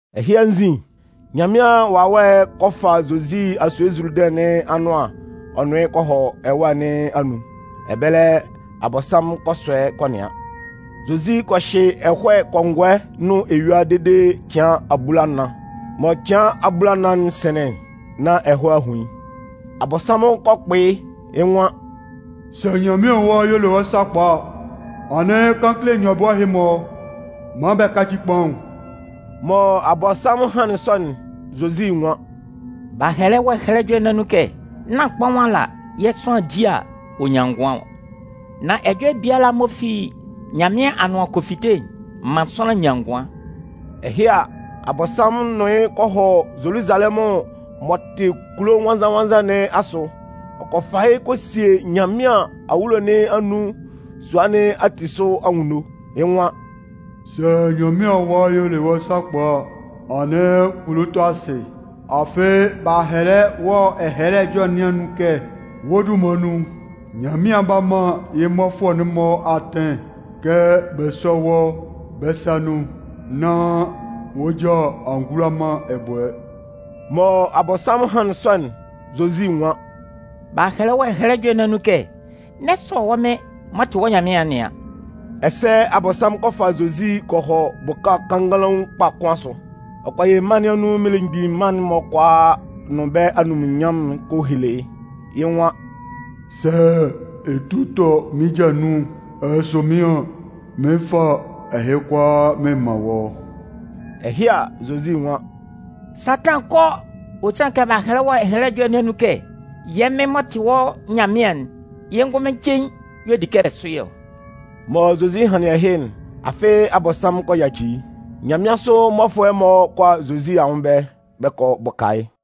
Ɛhɩ anzin, Nyanmɩan Wawɛ'n kɔ fa Zozi asue Zuludɩn nɩn anʋan ɔ nʋn yɩ́ kɔ hɔ ɛwâ nɩn anun. Ɛbɛlɛ, Abɔnsanmʋn kɔ sɔ yɩ́ kɔ nɩan. Zozi kɔ hyɩ ɛhɔɛ kɔngɔɛ nʋn eyua dede cɩan abulanan. Mɔ cɩan abulanan'n sɩnlɩn'n nán ɛhɔɛ a hun yɩ́. Abɔnsanmʋn kɔ kpʋ yɩ́. Yɩ́ nwan: “Sɛ Nyanmɩan Awa y'ɔ le wɔ́ sakpa a, anɩn kan kele nyɔbʋɛ ɛhɩ-mɔ maan bɛ káci kpaʋn.” Mɔ Abɔnsanmʋn hanlɩn sɔ'n, Zozi nwan: “B'a hɛlɛ wɔ Ɛhɛlɛ Ɛjɔlɛ nɩn anun kɛ: Nán kpaʋn ala yɛ̂ sʋanlan di a, ɔ nyan ngʋan ɔ. Nan ɛjɔlɛ biala m'ɔ fi Nyanmɩan anʋan kɔ fite'n, ɔ man sʋanlan nyan ngʋan.” Ɛhɩ a, Abɔnsanmʋn nʋn yɩ́ kɔ hɔ Zoluzalɛmʋn m'ɔ tɩ kulo nwannzan-nwannzan nɩn asʋ, ɔ kɔ fa yɩ́ kɔ sie Nyanmɩan awulo nɩn anun sua nɩn ati sʋ anwunno. Yɩ́ nwan: “Sɛ Nyanmɩan Awa y'ɔ le wɔ́ sakpa a, anɩn kulu tɔ asɩ. Afɩ b'a hɛlɛ wɔ Ɛhɛlɛ Ɛjɔlɛ nɩn anun kɛ: Wɔ́ dunman nun, Nyanmɩan 'ba man yɩ́ mmɔfʋɛ'n-mɔ atɩn kɛ bɛ sɔ́ wɔ́ bɛ́ sa nun nán wɔ́ ja a mgbula man ɛbʋɛ.” Mɔ Abɔnsanmʋn hanlɩn sɔ'n, Zozi nwan: “B'a hɛlɛ wɔ Ɛhɛlɛ Ɛjɔlɛ nɩn anun kɛ: N'ɛ sɔ yɛ́ Mɩn m'ɔ tɩ wɔ́ Nyanmɩan'n nɩan.” Ɛsɛ Abɔnsanmʋn kɔ fa Zozi kɔ hɔ bʋka kannganlaun kpa kʋn asʋ. Ɔ kɔ yɩ mân nɩn anun mmelemgbin mân'n-mɔ kʋalaa nʋn bɛ́ anunminnyanmʋn'n ɔ kɔ hele yɩ́. Yɩ́ nwan: “Sɛ ɛ tu tɔ mɩ́n ja nun ɛ sʋ mɩ́n an, mɩn 'fa ɛhɩ kʋalaa mɩn man wɔ́.” Ɛhɩ a, Zozi nwan: “Satan, kɔ! Ɔ sanlɩn kɛ b'a hɛlɛ wɔ Ɛhɛlɛ Ɛjɔlɛ nɩn anun kɛ: Yɛ́ Mɩn m'ɔ tɩ wɔ́ Nyanmɩan'n, yɩ́ ngʋnmɩn cein y'ɔ di kɛ ɛ sʋ yɩ́ ɔ.” Mɔ Zozi hanlɩn ɛhɩ'n, afɩ Abɔnsanmʋn kɔ yaci yɩ́. Nyanmɩansʋ mmɔfʋɛ'n-mɔ kɔ a Zozi anwʋn ɛbɛlɛ, bɛ kɔ bʋka yɩ́.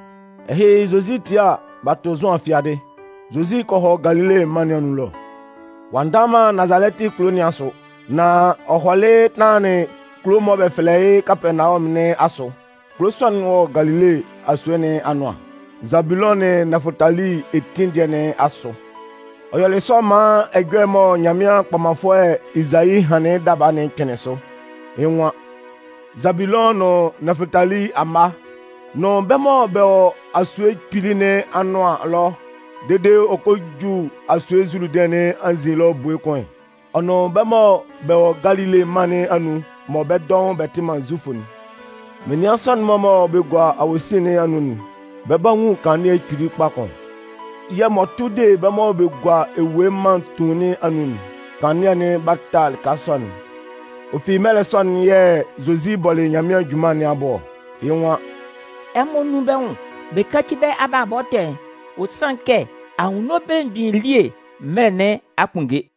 Ɛhɩ, Zozi 'tie a, b'a tʋ Zʋan fiadɩ. Zozi kɔ hɔ Galile mân nɩn anun ɛlɔ. Ɔ'a ndanlan man Nazalɛtɩ kulo nɩn asʋ. Nan ɔ hɔlɩ tanlanlɩn kulo'n mɔ bɛ fɛlɛ yɩ́ Kapɛɛnawɔmʋn nɩn asʋ. Kulo sɔ'n wɔ Galile asue nɩn anʋan, Zabulʋn nʋn Nɛfʋtali etin dɩɛ nɩn asʋ. Ɔ yɔlɩ sɔ maan ɛjɔlɛ'n mɔ Nyanmɩan kpɔmanfʋɛ Ezayi hanlɩn yɩ́ daba'n kpɩnlɩn sʋ. Yɩ́ nwan: Zabulʋn nʋn Nɛfʋtali amma nʋn bɛ́ mɔ bɛ wɔ Asue Kpili nɩn anʋan ɛlɔ dede ɔ kɔ ju asue Zuludɩn nɩn anzin ɛlɔ ebue kʋn, ɔ nʋn bɛ́ mɔ bɛ wɔ Galile mân nɩn anun mɔ bɛ́ dɔʋn bɛ tɩ man Zufʋ'n, menian sɔ'n-mɔ mɔ bɛ gua awosin nɩn anun'n, bɛ 'ba nwun kanlannɩɛ kpili kpa kʋn! Yɛ̂ m'ɔ tʋ de bɛ́ mɔ bɛ gua ewue mân tuun nɩn anun'n, kanlannɩɛ'n 'ba ta lɩka sɔ'n! Ɔ fi mɛlɛ sɔ'n yɛ̂ Zozi bɔlɩ Nyanmɩan junman nɩn abʋ ɔ. Yɩ́ nwan: “Ɛmɔ nún bɛ́ nwʋn bɛ yáci bɛ́ abalabɔ ɛtɛ'n. Ɔ sanlɩn kɛ Anwunno Belemgbin elie mɛlɛ nɩn a kpunnge!”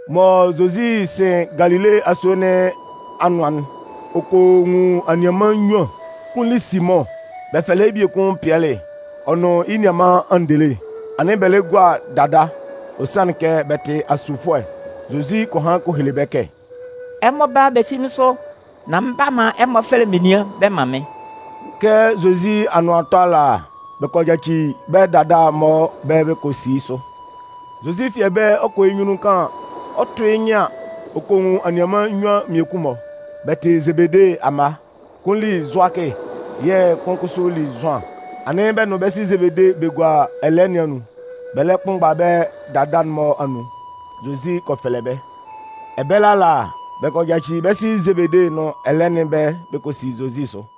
Mɔ Zozi 'sɩn Galile asue nɩn anʋan'n, ɔ kɔ nwun anianman nnyuan. Kʋn li Simʋn, bɛ fɛlɛ yɩ́ biekun Pɩɛlɩ, ɔ nʋn yɩ́ nianman Andele. Anɩn bɛ lɛ gua dada, ɔ sanlɩn kɛ bɛ tɩ asufuɛ. Zozi kɔ han kɔ hele bɛ́ kɛ: “Ɛmɔ bála bɛ sí mɩ́n sʋ, nán mɩn 'ba man ɛmɔ fɛfɛlɛ menian bɛ man mɩ́n.” Kɛ Zozi anʋan 'tɔ ala, bɛ kɔ yaci bɛ́ dada'n-mɔ ɛbɛlɛ bɛ kɔ si yɩ́ sʋ. Zozi fi ɛbɛlɛ ɔ kɔ hɔ yɩ́ nyunnun kaan, ɔ 'tʋ yɩ́ nyɩn an, ɔ kɔ nwun anianman nnyuan mmiekun-mɔ. Bɛ tɩ Zebede amma. Kʋn li Zʋakɩ yɛ̂ kʋn kʋsʋ li Zʋan. Anɩn bɛ nʋn bɛ́ sɩ Zebede bɛ gua ɛlɛɛ nɩn anun, bɛ lɛ kpʋnmgba bɛ́ dada'n-mɔ anun. Zozi kɔ fɛlɛ bɛ́. Ɛbɛlɛ ala, bɛ kɔ yaci bɛ́ sɩ Zebede nʋn ɛlɛɛ nɩn ɛbɛlɛ bɛ kɔ si Zozi sʋ.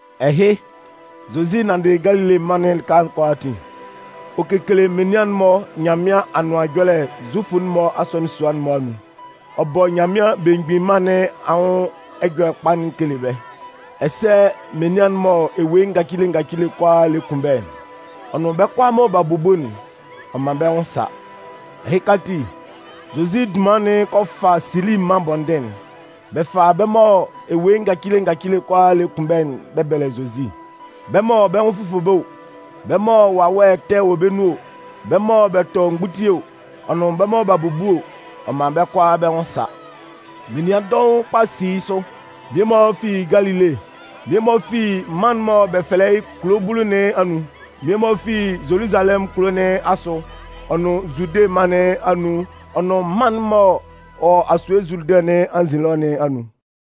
Ɛhɩ, Zozi nanndɩ Galile mân'n lɩka kʋalaatin. Ɔ kekele menian'n-mɔ Nyanmɩan Anʋan Ɛjɔlɛ'n Zufʋ'n-mɔ asɔnɩn sua'n-mɔ anun. Ɔ bɔ Nyanmɩan Belemgbin Mân nɩn anwʋn Ɛjɔlɛkpa'n ɔ kele bɛ́, ɛsɛ menian mɔ ewue ngacile ngacile kʋalaa lɛ kun bɛ́, ɔ nʋn bɛ́ kʋalaa mɔ b'a bubu'n, ɔ man bɛ́ nwʋn sa. Ɛhɩka ati, Zozi dunman'n kɔ fa Sili mân bɔndɩn'n. Bɛ fa bɛ́ mɔ ewue ngacile ngacile kʋalaa lɛ kun bɛ́'n bɛ bɛlɛ Zozi: bɛ́ mɔ bɛ́ nwʋn fʋfʋ bɛ́ o, bɛ́ mɔ wawɛ ɛtɛ'n-mɔ wɔ bɛ́ nun o, bɛ́ mɔ bɛ tɔ mgbutie o, ɔ nʋn bɛ́ mɔ b'a bubu o, ɔ man bɛ́ kʋalaa bɛ́ nwʋn sa. Menian dɔʋn kpa si yɩ́ sʋ. Mmie-mɔ fi Galile, mmie-mɔ fi mân'n mɔ bɛ fɛlɛ yɩ́ Kulo Bulu nɩn anun, mmie-mɔ fi Zoluzalɛmʋn kulo nɩn asʋ ɔ nʋn Zude mân nun ɔ nʋn mân'n m'ɔ wɔ asue Zuludɩn nɩn anzin ɛlɔ nɩn anun.